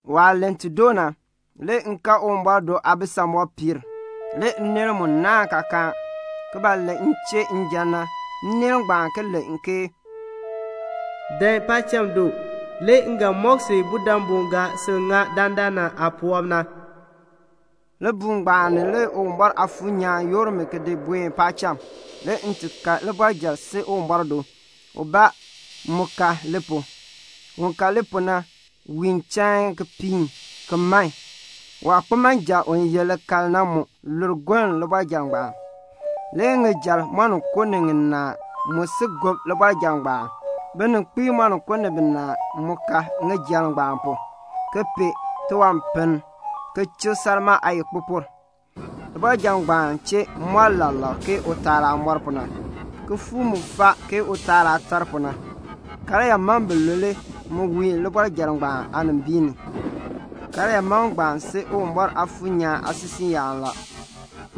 Waah len ti doo na, le m kan Uwumbɔr do aabisamɔb piir a. Le nneel mu naahn kaakaan ki nan len m chee njan na, nneel ngbaan ki len ke "Dan paacham du, le m ga mɔk si budabu ga sil ŋa dandana aapuwɔb na." Libuul ngbaan ni le Uwumbɔr Aafuur nyaan yoor mi ki di buen paacham. Le m kan libɔrjal si Uwumbɔr do; ubaa mu ka li pu. Un ka li pu na wiin chain ki piin, ki man. Waakpimanja u ye likal na lur goln libɔrjal ngbaan. Le ŋijal moninko ni ŋinaa mu si gob libɔrjal ngbaan. Bininkpiib moninko ni binaa mu ka ŋijal ngbaan pu, ki pee tiwanpiln, ki chik salmaa aayikpupur. Libɔrjal ngbaan chee moo lak lak ke utaal aah moor pu na, kifuuk mu faa ke utaal aah tar pu na. Karyaa mam bilule mu wiin libɔrjal ngbaan aanimbiin ni. Karyaa mam ngbaan si Uwumbɔr Aafuur nyaan aasisiiyaan la.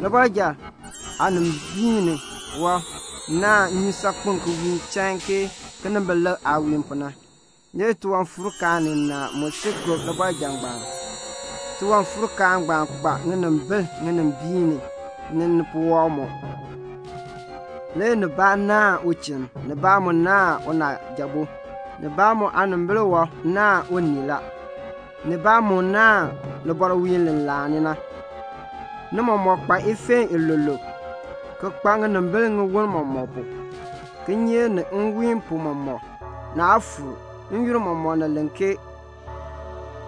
Libɔrjal aanimbiin ni wɔb naahn nnyusaakpem ki wiin chain ke kinimbilik aah wiin pu na. Le tiwanfuurkaan ninaa mu si gob libɔrjal ngbaan. Tiwanfuur-kaan ngbaan kpa ŋinimbil ninimbiin ni, ni nipuwɔb mɔk. Le ubaa naahn uchinn, ubaa mu naahn unaajabo, ubaa mu aanimbil wɔb naahn unii la, ubaa mu naahn libɔrwiin li laani na. Ni mɔmɔk kpa ifeen iluuluub, ki kpa ŋinimbil tiwon mɔmɔk pu. Kinyeek ni nwiin pu mɔmɔk, naa fuur; n-yoonn mɔmɔk ni len ke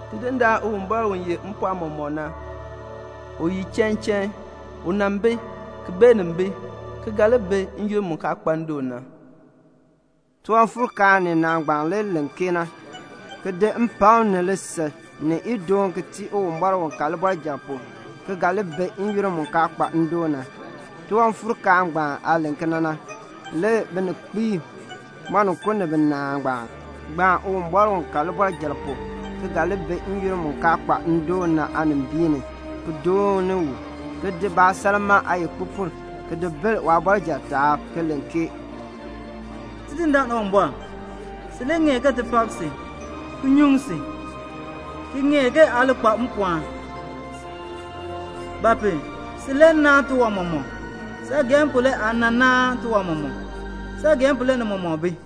"Tidindaan Uwumbɔr u yeh mpɔɔn mɔmɔk na, u ye chain chain. U nan bi, ki beenin bi, ki ga li bi n-yoonn mu kaa kpa ndoon na." Tiwanfuurkaan ninaa ngbaan le len kena, ki di mpakm ni lisil ni idoon ki tii Uwumbɔr u ka libɔrjal pu, ki ga li bi n-yoonn mu kaa kpa ndoon na. Tiwanfuurkaan ngbaan aah len kena na, le bininkpiib moninko ni binaa ngbaan gbaan Uwumbɔr u ka libɔrjal pu ki ga li bi n-yoonn mu kaa kpa ndoon na aanimbiin ni, ki dooni u, ki di baasalmaa aayikpupur ki di bil waabɔrjal aanimbiin ni, ki len ke "Tidindaan Uwumbɔr, si le ŋeer ke ti pak si, ki nyuŋ si, ki ŋeer aa li kpa mpɔɔn; ba pu? si le naan tiwan mɔmɔk. Saageehn pu le aa nan naan tiwan mɔmɔk. Saageehn pu le ni mɔmɔk bi."